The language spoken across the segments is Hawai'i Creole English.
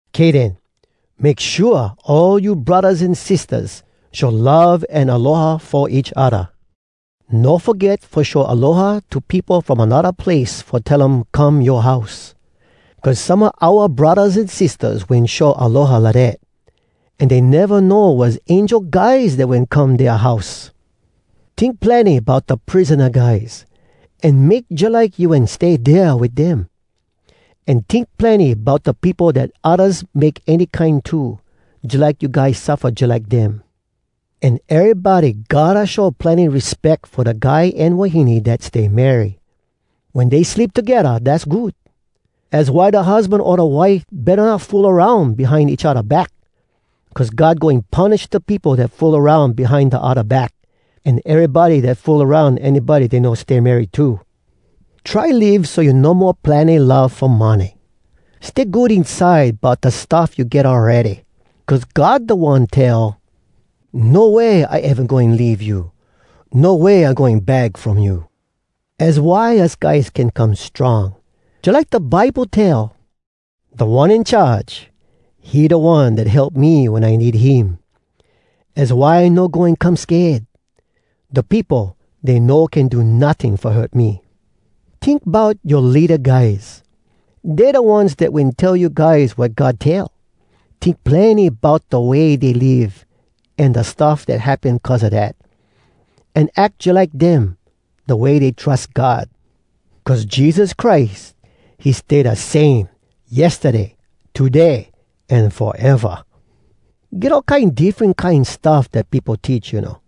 Kay den, make shua all you braddahs an sistahs show love an aloha fo each odda. No foget fo show aloha to peopo from anodda place fo tell um come yoa house. Cuz some a oua braddahs an sistahs wen show aloha lidat, an dey neva know was angel guys dat wen come dea house. Tink plenny bout da prisona guys, an make jalike you wen stay dea wit dem. An tink plenny bout da peopo dat oddas make any kine to, jalike you guys suffa jalike dem. An erybody gotta show plenny respeck fo da guy an wahine dat stay marry. Wen dey sleep togedda, dass good. Az why da husban o da wife betta not fool aroun behind each odda back. Cuz God goin punish da peopo dat fool aroun behind da odda back, an erybody dat fool aroun anybody dey no stay married to. Try live so you no mo plenny love fo money. Stay good inside bout da stuff you get awready. Cuz God da One tell, “No way I eva goin leave you! No way I goin bag from you!” Az why us guys can come strong, jalike da Bible tell: “Da One In Charge, he da One dat help me wen I need him. Az why I no goin come sked. Da peopo, dey no can do notting fo hurt me!” Tink bout yoa leada guys. Dey da ones dat wen tell you guys wat God tell. Tink plenny bout da way dey live, an da stuff dat happen cuz a dat. An ack jalike dem, da way dey trus God. Cuz Jesus Christ, he stay da same, yestaday, today, an foeva! Get all kine diffren kine stuff dat peopo teach, you know.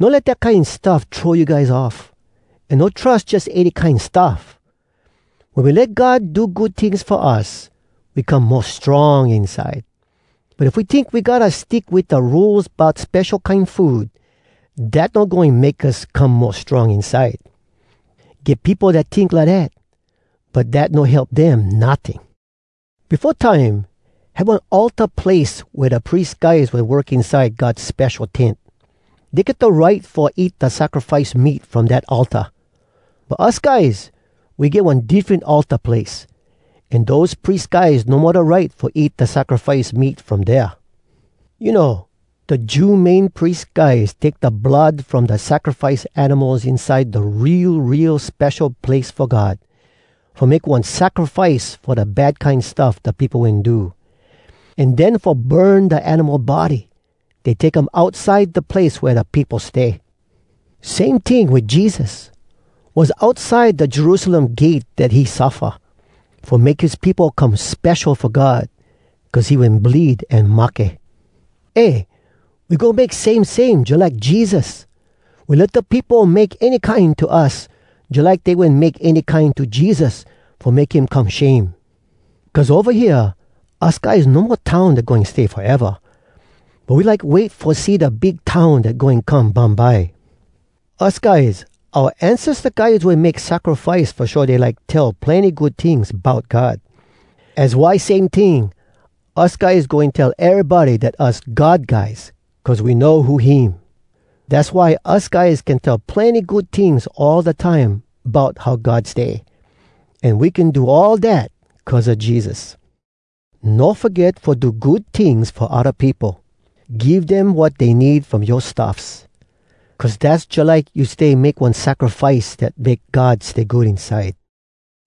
No let dat kine stuff throw you guys off, an no trus jus any kine stuff! Wen we let God do good tings fo us, we come mo strong inside. But if we tink we gotta stick wit da rules bout spesho kine food, dat no goin make us come mo strong inside. Get peopo dat tink lidat. But dat no help dem, notting! Befo time, had one altar place wea da pries guys wen work inside God Spesho Tent. Dey get da right fo eat da sacrifice meat from dat altar. But us guys, we get one diffren altar place. An dose pries guys no mo da right fo eat da sacrifice meat from dea. You know, da Jew Main Pries guys take da blood from da sacrifice animals inside da Real, Real Spesho Place Fo God, fo make one sacrifice fo da bad kine stuff da peopo wen do. An den fo burn da animal body, dey take um outside da place wea da peopo stay. Same ting wit Jesus. Was outside da Jerusalem gate dat he suffa, fo make his peopo come spesho fo God, cuz he wen bleed an mahke. Eh! We go make same same jalike Jesus. We let da peopo make any kine to us, jalike dey wen make any kine to Jesus fo make him come shame. Cuz ova hea, us guys no mo town dat goin stay foeva. But we like wait fo see da big town dat goin come bumbye. Us guys, oua ancesta guys wen make sacrifice fo show dey like tell plenny good tings bout God. Az why same ting, us guys goin tell erybody dat us God guys cuz we know who him! Dass why us guys can tell plenny good tings all da time bout how God stay. An we can do all dat cuz a Jesus. No foget fo do good tings fo odda peopo. Give dem wat dey need from yoa stuffs. Cuz dass jalike you stay make one sacrifice dat make God stay good inside.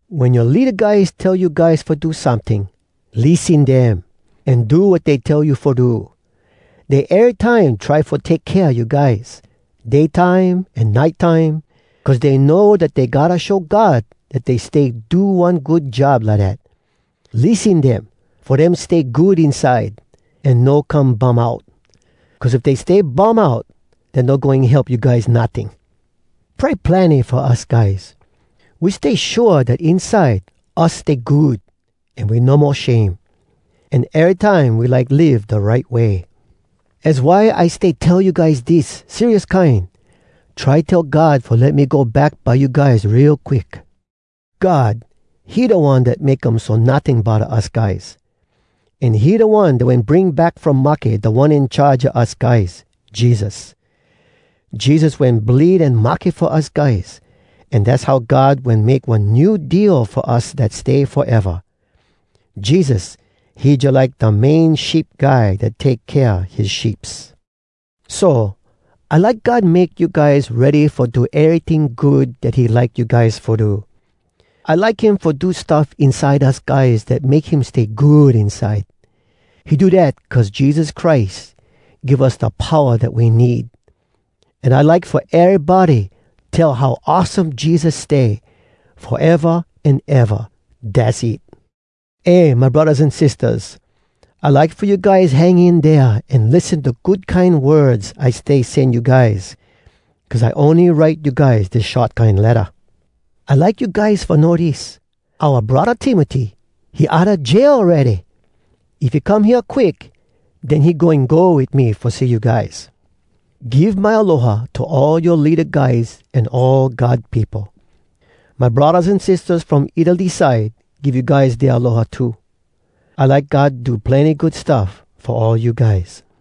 Wen yoa leada guys tell you guys fo do someting, lissen dem, an do wat dey tell you fo do. Dey erytime try fo take kea you guys, day time an nite time, cuz dey know dat dey gotta show God dat dey stay do one good job lidat. Lissen dem, fo dem stay good inside, an no come bum out. Cuz if dey stay bum out, dat no goin help you guys notting. Pray plenny fo us guys. We stay shua dat inside us stay good an we no mo shame. An erytime we like live da right way. Az why I stay tell you guys dis, serious kine: Try tell God fo let me go back by you guys real quick. God, he da One dat make um so notting bodda us guys. An he da One dat wen bring back from mahke Da One In Charge a us guys, Jesus. Jesus wen bleed an mahke fo us guys, an dass how God wen make one New Deal fo us dat stay foeva. Jesus, he jalike da main sheep guy dat take kea his sheeps. So, I like God make you guys ready fo do eryting good dat he like you guys fo do. I like him fo do stuff inside us guys dat make him stay good inside. He do dat cuz Jesus Christ give us da powa dat we need. An I like fo erybody tell how awesome Jesus stay, foeva an eva! Dass it! Eh, my braddahs an sistahs, I like fo you guys hang in dea an lissen da good kine words I stay sen you guys, cuz I ony write you guys dis short kine letta. I like you guys fo know dis: oua braddah Timoty, he outa jail awready! If he come hea quick, den he goin go wit me fo see you guys. Give my aloha to all yoa leada guys an all God peopo. My braddahs an sistahs from Italy side give you guys dea aloha too. I like God do plenny good stuff fo all you guys.